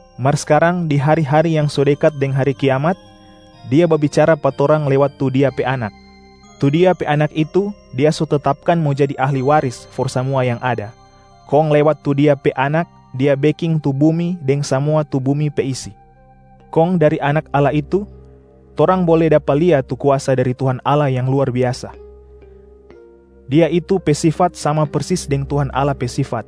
mar skarang di hari-hari yang so dekat deng hari kiamat, Dia babicara pa torang lewat tu Dia pe Anak. Tu Dia pe anak itu Dia so tetapkan mo jadi ahli waris for samua yang ada, kong lewat tu Dia pe anak Dia beking tu bumi deng samua tu bumi pe isi. Kong dari Anak Allah itu, torang bole dapa lia tu kuasa dari Tuhan Allah yang luar biasa. Dia itu pe sifat sama persis deng Tuhan Allah pe sifat.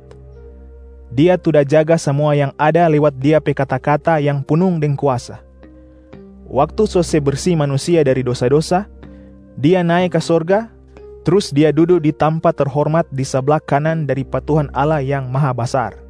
Dia tu da jaga samua yang ada lewat Dia pe kata-kata yang punung deng kuasa. Waktu so se bersi manusia dari dosa-dosa, Dia nae ka sorga, trus Dia dudu di tampa terhormat di sabla kanan dari pa Tuhan Allah Yang Mahabasar.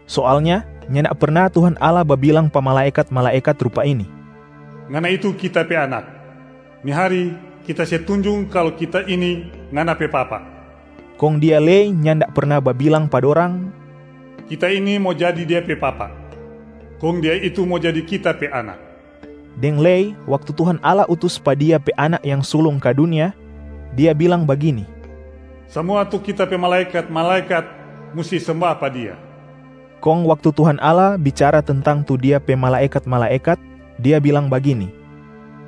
Soalnya nyanda perna Tuhan Allah babilang pa malaekat-malaekat rupa ini, “Ngana itu Kita pe Anak. Ni hari, Kita se tunjung kalu Kita ini Ngana pe Papa.” Kong Dia lei nyanda perna babilang pa dorang, “Kita ini mo jadi Dia pe Papa, kong Dia itu mo jadi Kita pe Anak.” Deng lei, waktu Tuhan Allah utus pa Dia pe Anak yang sulung ka dunia, Dia bilang bagini, “Samua tu Kita pe malaekat-malaekat musti semba pa Dia.” Kong waktu Tuhan Allah bicara tentang tu Dia pe malaekat-malaekat, Dia bilang bagini,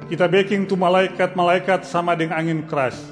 “Kita beking tu malaekat-malaekat sama deng angin kras,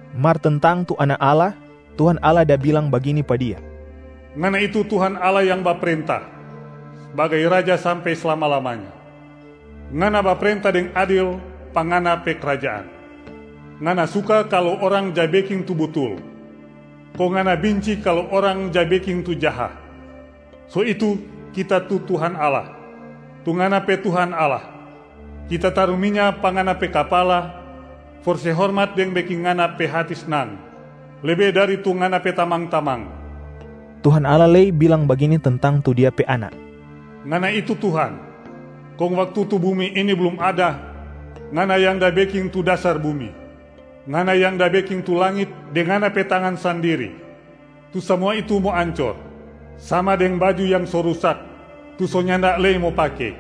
Mar tentang tu Anak Allah, Tuhan Allah da bilang bagini pa Dia, “Ngana itu Tuhan Allah yang baprenta sbagai Raja sampe slama-lamanya. Ngana baprenta deng adil pa Ngana pe krajaan. Ngana suka kalu orang ja beking tu butul, kong Ngana binci kalu orang ja beking tu jaha. So itu Kita tu Tuhan Allah, tu Ngana pe Tuhan Allah, Kita taru minya pa Ngana pe kapala for se hormat deng beking Ngana pe hati snang lebe dari tu Ngana pe tamang-tamang.” Tuhan Allah lei bilang bagini tentang tu Dia pe Anak, “Ngana itu Tuhan, kong waktu tu bumi ini blum ada, Ngana yang da beking tu dasar bumi, Ngana yang da beking tu langit deng Ngana pe tangan sandiri. Tu samua itu mo ancor, sama deng baju yang so rusak tu so nyanda lei mo pake,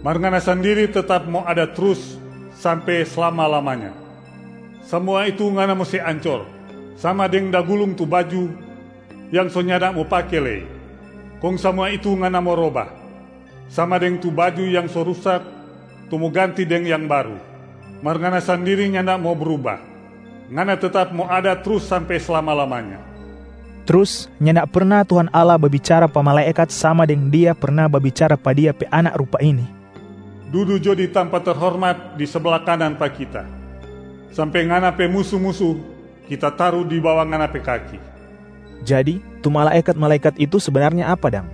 mar Ngana sandiri tetap mo ada trus sampe slama-lamanya. Samua itu Ngana mo se ancor, sama deng da gulung tu baju yang so nyanda mo pake lei, kong samua itu Ngana mo roba, sama deng tu baju yang so rusak tu mo ganti deng yang baru. Mar Ngana sandiri nyanda mo bruba, Ngana tetap mo ada trus sampe slama-lamanya.” Trus nyanda perna Tuhan Allah babicara pa malaekat sama deng Dia perna babicara pa Dia pe Anak rupa ini, “Dudu jo di tampa terhormat di sabla kanan pa Kita, sampe Ngana pe musu-musu Kita taru di bawa Ngana pe kaki.” Jadi tu malaekat-malaekat itu sebenarnya apa dang?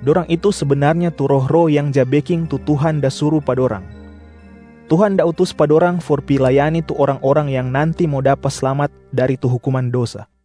Dorang itu sebenarnya tu roh-roh yang ja beking tu Tuhan da suru pa dorang. Tuhan da utus pa dorang for pi layani tu orang-orang yang nanti mo dapa slamat dari tu hukuman dosa.